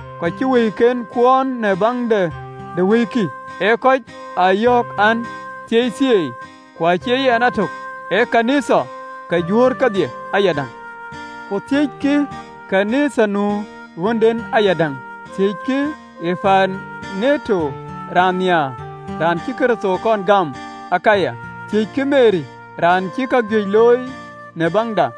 kɔc cï wëiken kuɔɔn në baŋ de wëikï, ee kɔc aa yɔ̈ɔ̈k an, Thieithieei, ku acie yɛn a tök, ee ɣööt ke Nhialic ke Juöör kedhie ayadäŋ. Ku thiëckï ɣön ë Nhialic ee lɔ̈ŋ ɣönden ayadäŋ. Thiëckï Epaineto raan nhiaar, raan cï Kërtho kɔn gam në Akaya. Thiëckï Meri, raan cï kajuëc looi në baŋda.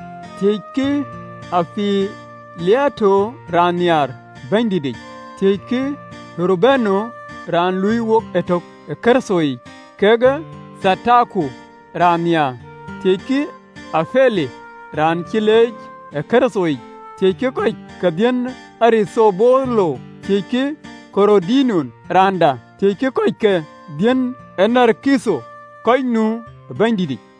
Thiëckï Ampiliato raan nhiaar ë Bɛ̈nydïtic. Thiëckï Urbano raan ë luui wok ëtök ë Kërtho yic, kekë Thataku raan nhiaar. Thiëckï Apele raan cï leec ë Kërtho yic. Thiëckï kɔc ke baai de Arithobolo. Thiëckï Ɣerodion raanda. Thiëckï kɔc ke baai de Narkitho kɔc nu ë Bɛ̈nydïtic.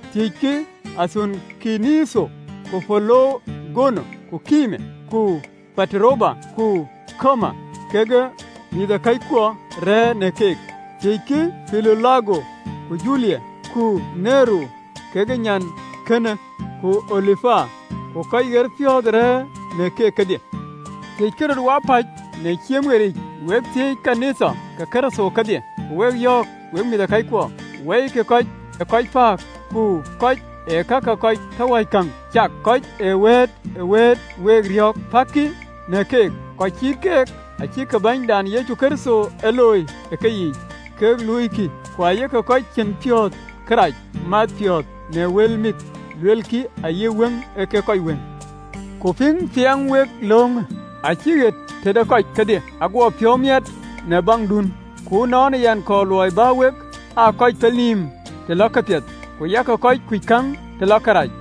Thiëckï Athunkiritho ku Pelogon, ku Ɣereme, ku Pataroba, ku Ɣerma, kekë mïthëkɔckuɔn rɛ̈ɛ̈r në keek. Thiëckï Pilolago ku Julia, ku Nereu kekë nyankënë, ku Olumpa, ku kɔc ɣerpiɔ̈ɔ̈th rɛ̈ɛ̈r në keek kedhie. Thiëckï röt wapäc në ciëm ɣeric. Wek thiëëc ɣööt ke Nhialic ke Kërtho kedhie. Ku wek yɔ̈ɔ̈k, wek mïthëkɔckuɔ, wɔikï kɔc ee kɔc pääk, kɔc ee kak ee kɔc tɔ wäc käŋ cak, kɔc ee wëët ë wëëtë week riɔ̈ɔ̈k, päkkï në keek. Kɔc cït keek acïkï Bɛ̈nydan Yecu Kërtho ee luööi, ee keyiic kek luuikï, ku ayek kɔc cïn piɔ̈ɔ̈th kërac math piɔ̈ɔ̈th në wël mit luelkï, ayï wëŋ ee kek kɔc wëŋ. Ku piŋ piɛŋ wek löŋ acï ɣet tëde kɔc kedhie. Aguɔ piɔ̈u miɛt në baŋdun, ku ënɔɔnë yɛn kɔɔr luɔi bä wek aa kɔc pelnïïm të lɔ këpiɛth, ku yak kɔc kuc käŋ të lɔ kërac.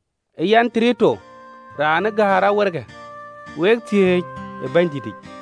Yɛn Tertio, raan ë gäär awerekë, wek thiëëc ë Bɛ̈nydïtic.